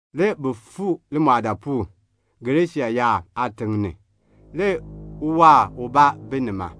Le bi fuu limɔɔdaapuul, Gerasiin yaab aatiŋ ni. Le uwaar ubaa bi nima.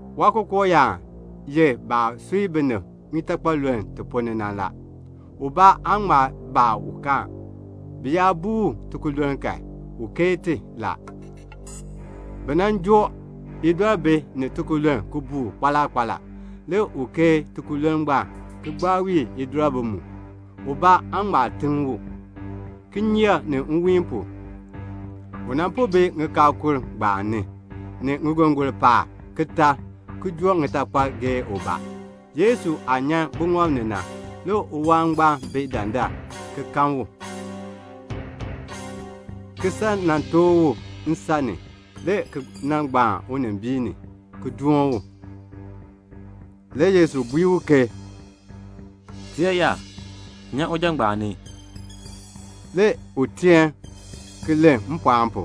Waakookooyaan ye baah sui binib titakpaluln ti ponn ni na la. Ubaa aa ŋma joo u. Bi yaa buu u tikululn kan, u keei ti la. Bi nan joo idɔribi ni tikululn ki buu u kpaala kpaala. Le u kii tikululn ngbaan, ki gbaa wii idɔribi mu. Ubaa aa ŋma tiŋ u. Kinyeek ni nwiin pu, u po bi ŋikaakul ngbaan ni, ni ŋigongon paab, ki tar, ki joo ŋitakpal geei ubaa. Yesu aah nyan buŋɔb ni na, le uwaar ngbaan bi dandar, le ki kan u, ki san nan tooh u nsan ni, le ki nan gbaan unimbiin ni, ki doon u. Le Yesu bui ke, "Tiyaayar, nyan uja ngbaan ni." Le u teen le ki len mpɔɔn pu,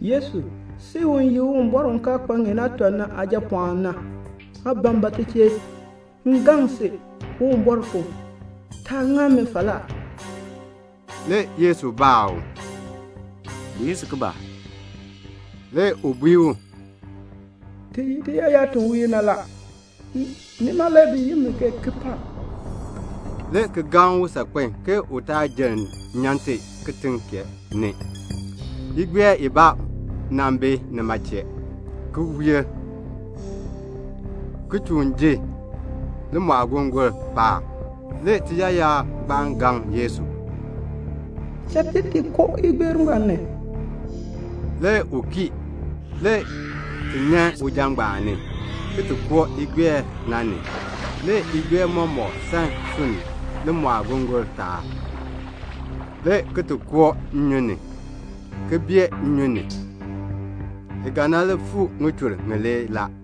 "Yesu, si u ye Uwumbɔr u kaa kpa ŋeen aatɔ na Aajapɔɔn na, aa ban ba m chee? M gaŋ si Uwumbɔr pu, taa ŋa mi falaa." Le Yesu baa u, "Bi yi si ke ba?" Le u bui u, "Ti ye tiyaayar ti wiir na, nima le bi yi mi ke Kipaak," le ki gaŋ u saakpen ke u taa jenn nyan ti kitiŋ kee ni. Le igbeer bi nima chee, ki wiir, ki chuun ji limɔɔgongoln paab. Le tiyaayar ngbaan gaŋ Yesu, "Cha ti ti koo igbeer ngbaan ni." Le u kii. Le ti nyan uja ngbaan ni, le ki koo igbeer na ni. Le igbeer mɔmɔk san sunni limɔɔgongoln taab, le ki koo nnyun ni, le ki bee nnyun ni. I ga nan li fuu ŋichur ŋilee la.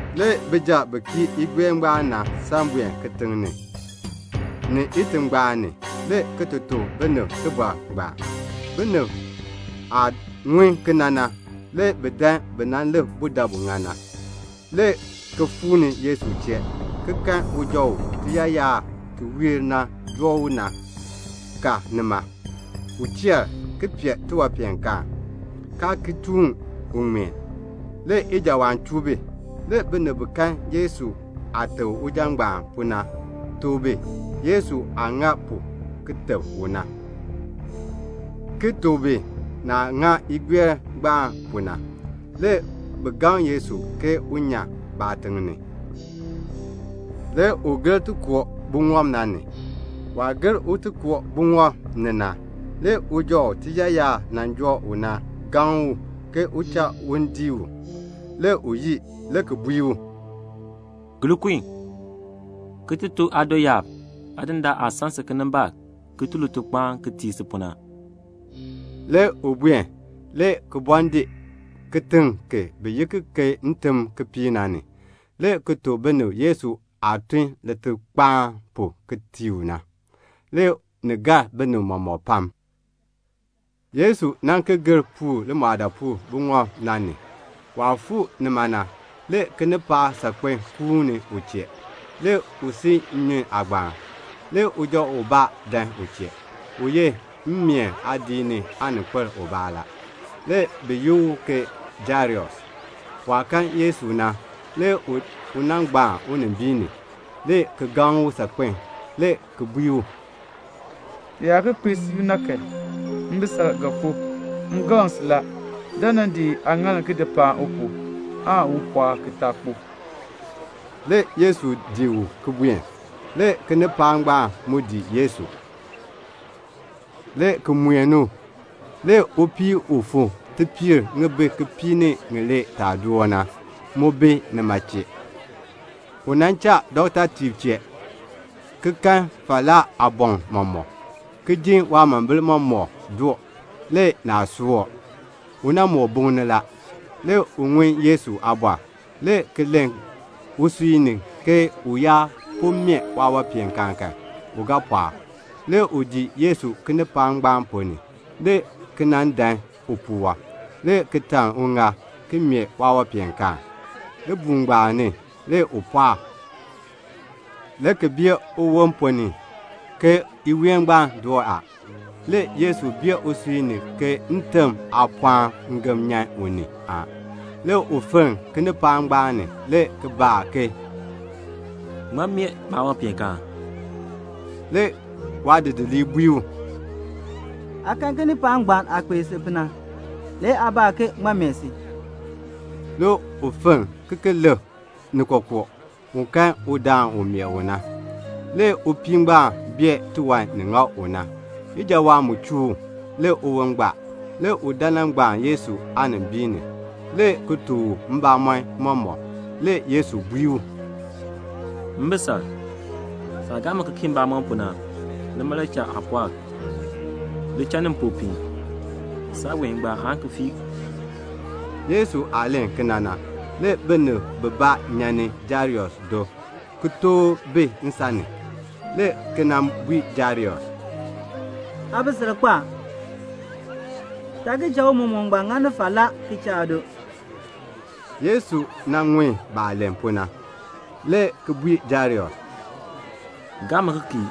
Le bijab bi kii igbeer ngbaan na san buen kitiŋ ni, ni itingbaan ni, le ki ti tuk binib tibɔr ngbaan. Binib aah ŋun kena na, le bi dan bi nan lik budabu ŋa na, le ki fuu ni Yesu chee, ki kan uja u tiyaayar ti wiir na nan joo u na, ka nima. U cheer, ki pee tiwanpeenkaan, kaa ki chuun u ŋmeen. Le ijawaan chuu bi. Le binib bi kan Yesu aah teb uja ngbaan pu na, tuk bi Yesu aah ŋa pu ki teb u na, ki tuk bi naah ŋa igbeer ngbaan pu na. Le bi gaŋ Yesu ke un nyan baatiŋ ni. Le u gir ti koo buŋɔb na ni. Waah gir un ti koo buŋɔb ni na, le uja u tiyaayar nan joo u na gaŋni u ke u cha un dii u. Le u yii, le ki bui u, "Gir kun, ki ti tuk aadoyaab Aadindaan aah san si kinimbaak ki tun litukpaan ki tii si pu na." Le u buen, le ki bɔɔ dii kitiŋ ki bi yi ki ke Ntimkipiik, le ki tuk binib Yesu aah tun litukpaan pu ki tii u na. Le ni gar binib mɔmɔk pam. Le Yesu ki gir puur limɔɔdaapuul buŋɔb na ni. Waah fuu nima na, le kinipaak saakpeŋ kuuni u chee. Le u si nnyun aagbaan. Le uja ubaa dan u chee. U ye mmeen aadiik ni aaninkpil ubaa la. Le bi yi u ke Jairus. Waah kan Yesu na, le u nan gbaan unimbiin ni, le ki gaŋ u saakpen le ki bui u, "Ni kpee siib na, mbisal ga kpo. M gaŋ si la, dan nan di aaŋaal ki di paan u pu, aan u pɔɔk ki taa kpo." Le Yesu dii u ki buen. Le kinipaak ngbaan mu dii Yesu, le ki mueni u. Le upii u fuu tipiir ŋibin kipiik ni ŋilee taa door na, mu bi nima chee. U nan cha dɔktatiib chee, ki kan falaa aaboŋ mɔmɔk, ki jin waamombil mɔmɔk doo, le naa soor. U moo buŋni la. Le u ŋun Yesu aabɔr, le ki len usui ni ke u yaa po meeh waawanpeenkaan kan, u ga pɔɔk. Le u dii Yesu kinipaak ngbaan ponn ni, le ki nan dan upuwɔb, le ki taln uŋaal, ki meeh waawanpeenkaan. Libuul ngbaan ni, le u pɔɔk, le ki bee uwon ponn ni ke iween ngbaan doo a. Le Yesu bee usui ni ke ntebm aapɔɔn ngem nyan u ni a. Le u fenn kinipaak ngbaan ni, le ki baa ke, "Ŋmaa meeh maawanpeenkaan?" Le waadidiliib bui u, "Aa kan kinipaak ngbaan aah kpei si pu na, le aa baa ke ŋmaa meeh si?" Le u fenn, ki lik ni kookoo, un kan udaan u meeh u na. Le upii ngbaan bee tiwan ni ŋa u na. Ijawaan chuu u, le uwon gbaa. Le u dan nan gbaan Yesu aanimbiin ni, le ki tuk u mbamɔn mɔmɔk. Le Yesu bui u, "Mbisal, saah gaa mi ki kii mbamɔm pu na, nima le cha aa pɔɔk. Li cha ni mpopiin. Saaween ngbaan aan ki fii." Yesu aah len kena na, le binib bibaa nyan ni Jairus do, ki tooh bi nsan ni, le ki nan bui Jairus, "Aabisal kpo a. Taa ki cha Tiicha ngbaan ŋani falaa ki cha aado." Le Yesu ŋun baah len pu na, le ki bui Jairus, "Gaa mi ki kii,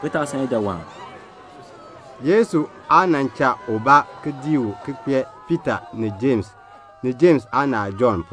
ki taa san ijawaan." Le Yesu aa cha ubaa dii u, see Piita ni Jems, ni Jems aanaal Jɔnn.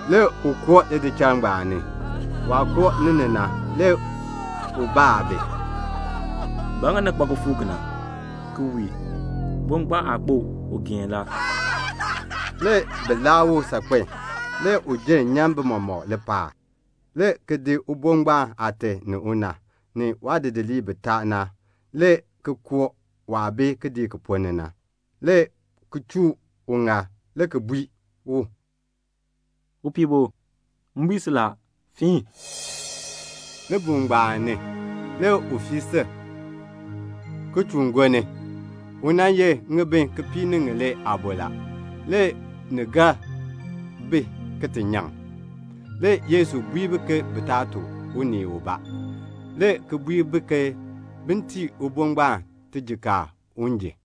Le u koo lidichal ngbaan ni. Waah koo ni na, le u baa bi, "Ba ŋa ni kpa kifuuk kena, ki wii? Ubo ngbaan aa kpo. U geen la." Le bi laa u saakpen. Le u jenn nyan bi mɔmɔk lipaal, le ki di ubo ngbaan aate ni una, ni waadidiliib bitaa na, le ki koo waah bi kidiik ki ponn ni na, le ki chuu uŋaal, le ki bui u, "Upiibo, m bui si la, fiin." Libuul ngbaan ni, le u fii sil, ki chuun gonni. U nan ye ŋibin kipiik ni ŋilee aabo la. Le ni gar bi ki ti nyaŋ. Le Yesu bui bi ke bi taa tuk unii ubaa, le ki bui bi ke bin tii upiibo ngbaan tijikaar un ji.